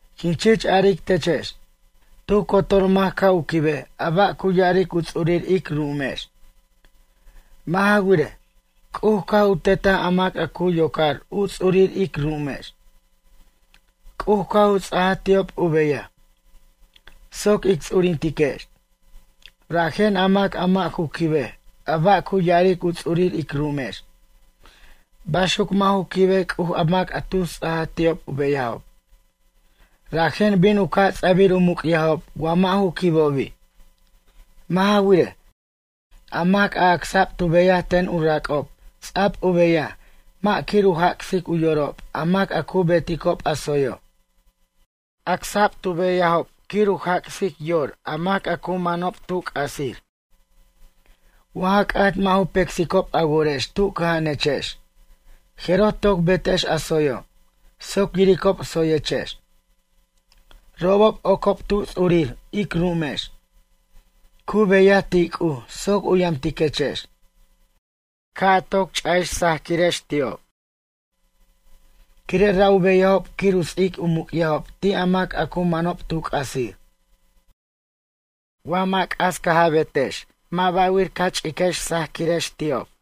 Quin chich aric techex. Tu cotor mac ca' u quibej a ba' cu ya'aric u ts'urir ic ru'umex. Mʌ' ja wirej, C'uj caj u tetaj a mac a cu yocar u ts'urir ic ru'umex. C'uj caj u ts'ajaj ti'ob u beyaj soc ic ts'urintiquex. Rajen a mac a mʌ' ju quibej a ba' cu ya'aric u ts'urir ic ru'umex, baxuc mʌ' ju quibej C'uj a mac a tu ts'aj ti'ob u beyajob. Rajen bin u ca' ts'abir u muc'yajob wa mʌ' ju quibobi'. Mʌ' ja wirej, a mac a acsa'b tu beyaj ten u rac'ob, ts'a'b u beyaj mʌ' quir u jac'sic u yorob a mac a cu beticob a tsoyo'. Acsa'b tu beyajob quir u jac'sic yor a mac a cu manob tu c'asir. Wa ja c'at mʌ' ju pecsicob a worex tu cʌja'anechex, jeroj toc betex a tsoyo', soc yiricob tsoyechex. Robob ocob tu ts'urir ic ru'umex, cu beyaj ti' C'uj soc u yamtiquechex. Ca' toc ch'ajex sajquirex ti'ob, quire' ra' u beyajob quir u ts'ic u muc'yajob ti' a mac a cu manob tu c'asir. Wa mʌ' c'as caj a betex mʌ' ba'wir ca ch'iquirex sajquirex ti'ob.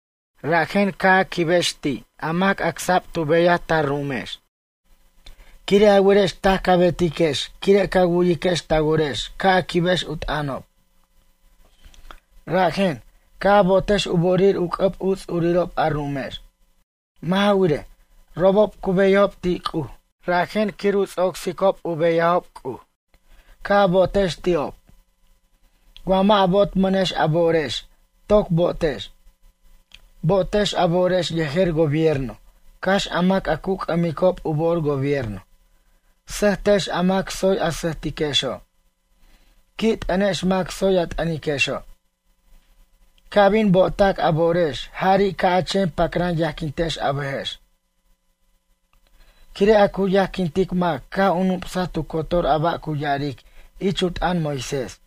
Rajen, ca' a quibex ti' a mac acsa'b tu beyaj ta ru'umex. Quire' a werex taj ca betiquex quire' ca wu'yiquex ta worex ca' a quibex u t'ʌnob. Rajen, ca' a bo'otex u bo'orir u c'ʌb u ts'urirob a ru'umex. Mʌ' ja wirej, robob cu beyajob ti' C'uj, rajen quir u ts'ocsicob u beyajob C'uj. Ca' a bo'otex ti'ob. Wa mʌ' a bo'tmʌnex a bo'orex, toc bo'tex. Bo'otex a bo'orex yejer gobierno, cax a mac a cu c'ʌmicob u bo'or gobierno. Sʌjtex a mac tsoy a sʌjtiquexo'. Qui' t'ʌnex a mac tsoy a t'ʌniquexo'. Ca' bin bo'otac a bo'orex jari' ca' a chen pacran yajquintex a bʌjex. Quire' a cu yajquintic mac caj u nup'saj tu cotor a ba' cu ya'aric ich u t'ʌn Moisés.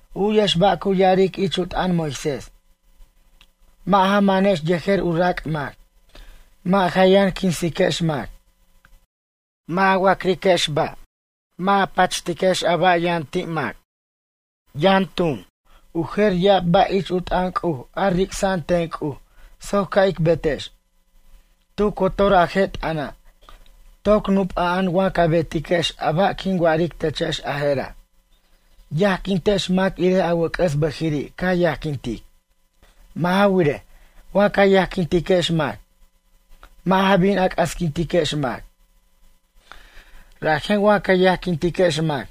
U'yex ba' cu ya'aric ich u t'ʌn Moisés: “Mʌ' ja manex yejer u rac' mac. Mʌ' ja yʌn quinsiquex mac. Mʌ' ja wa'criquex ba'. Mʌ' ja pachtiquex a ba' yʌn mac.” Yʌn tun, u jer ya'ab ba' ich u t'ʌn C'uj a ric'sa'an ten C'uj soc ca' ic betex. Tu cotor a je' t'ʌna', toc nup'a'an wa ca betiquex a ba' quin wa'aric techex a jera': “Yajquintex mac irej a wʌc'ʌs bʌjiri' ca yajquintic.” Mʌ' ja wirej, wa ca yajquintiquex mac, mʌ' ja bin a c'asquintiquex mac. Rajen wa ca yajquintiquex mac,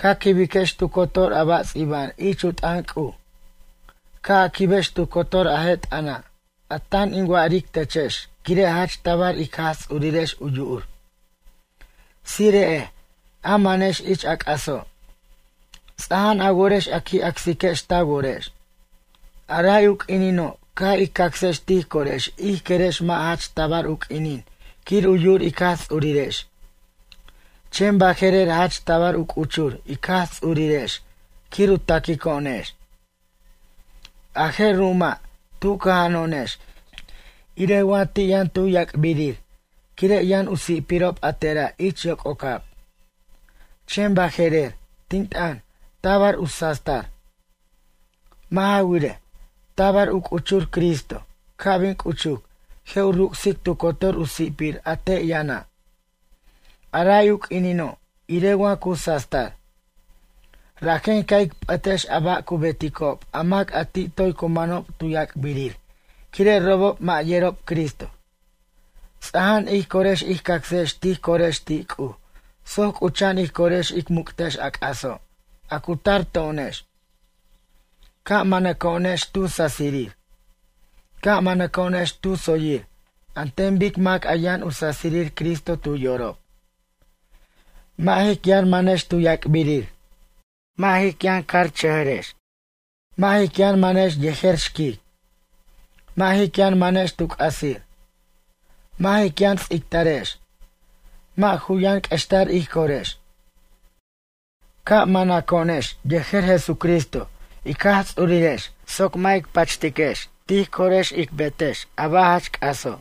ca quibiquex tu cotor a ba' ts'iba'an ich u t'ʌn C'uj. Ca' a quibex tu cotor a je' t'ʌna', a tan tin wa'aric techex quire' jach tabar ic Jaj Ts'urirex u yu'ur. Tsire'ej, a manex ich a c'aso'. Ts'aja'an a worex a qui' acsiquex ta worex. A ray u q'uinino' caj ij cacsex tij corex ij querex mʌ' jach tabar u q'uinin quir u yu'ur ic Jaj Ts'urirex, chen baje'rer jach tabar u c'uchur ij Jaj Ts'urirex quir u taquico'onex. A je' ru'uma', tu cʌja'ano'onex irej wa ti' yʌn tu yac'birir quire' yʌn u si'pirob a tera' ich yoc'ocab. Chen baje'rer, tin t'ʌn, tabar u sastar. Mʌ' ja wirej, tabar u c'uchur Cristo, ca' bin c'uchuc, je' u ruc'sic tu cotor u si'pir a te' yʌna'. A ray u q'uinino', irej wa cu sastar. Rajen ca' ic p'ʌtex a ba' cu beticob a mac a ti' toy cu manob tu yac'birir quire' robob mʌ' yerob Cristo. Ts'aja'an ij corex ij cacsex tij corex ti' C'uj soc c'ucha'an ij corex ic muc'tex a c'aso', a cu tar to'onex. Ca' manaco'onex tu sasirir. Ca' manaco'onex tu tsoyir an ten bic mac a yʌn u sasirir Cristo tu yorob. Mʌ' jic yʌn manex tu yac'birir. Mʌ' jic yʌn cajchʌjʌrex. Mʌ' jic yʌn manex yejer xquic. Mʌ' jic yʌn manex tu c'asir. Mʌ' jic yʌn ts'ictarex. Mʌ' ju yʌn q'uextar ij corex. Ca' manaco'onex yejer Jesucristo ic Jaj Ts'urirex soc mʌ' ic pachiquex tij corex ic betex a ba' jach c'aso'.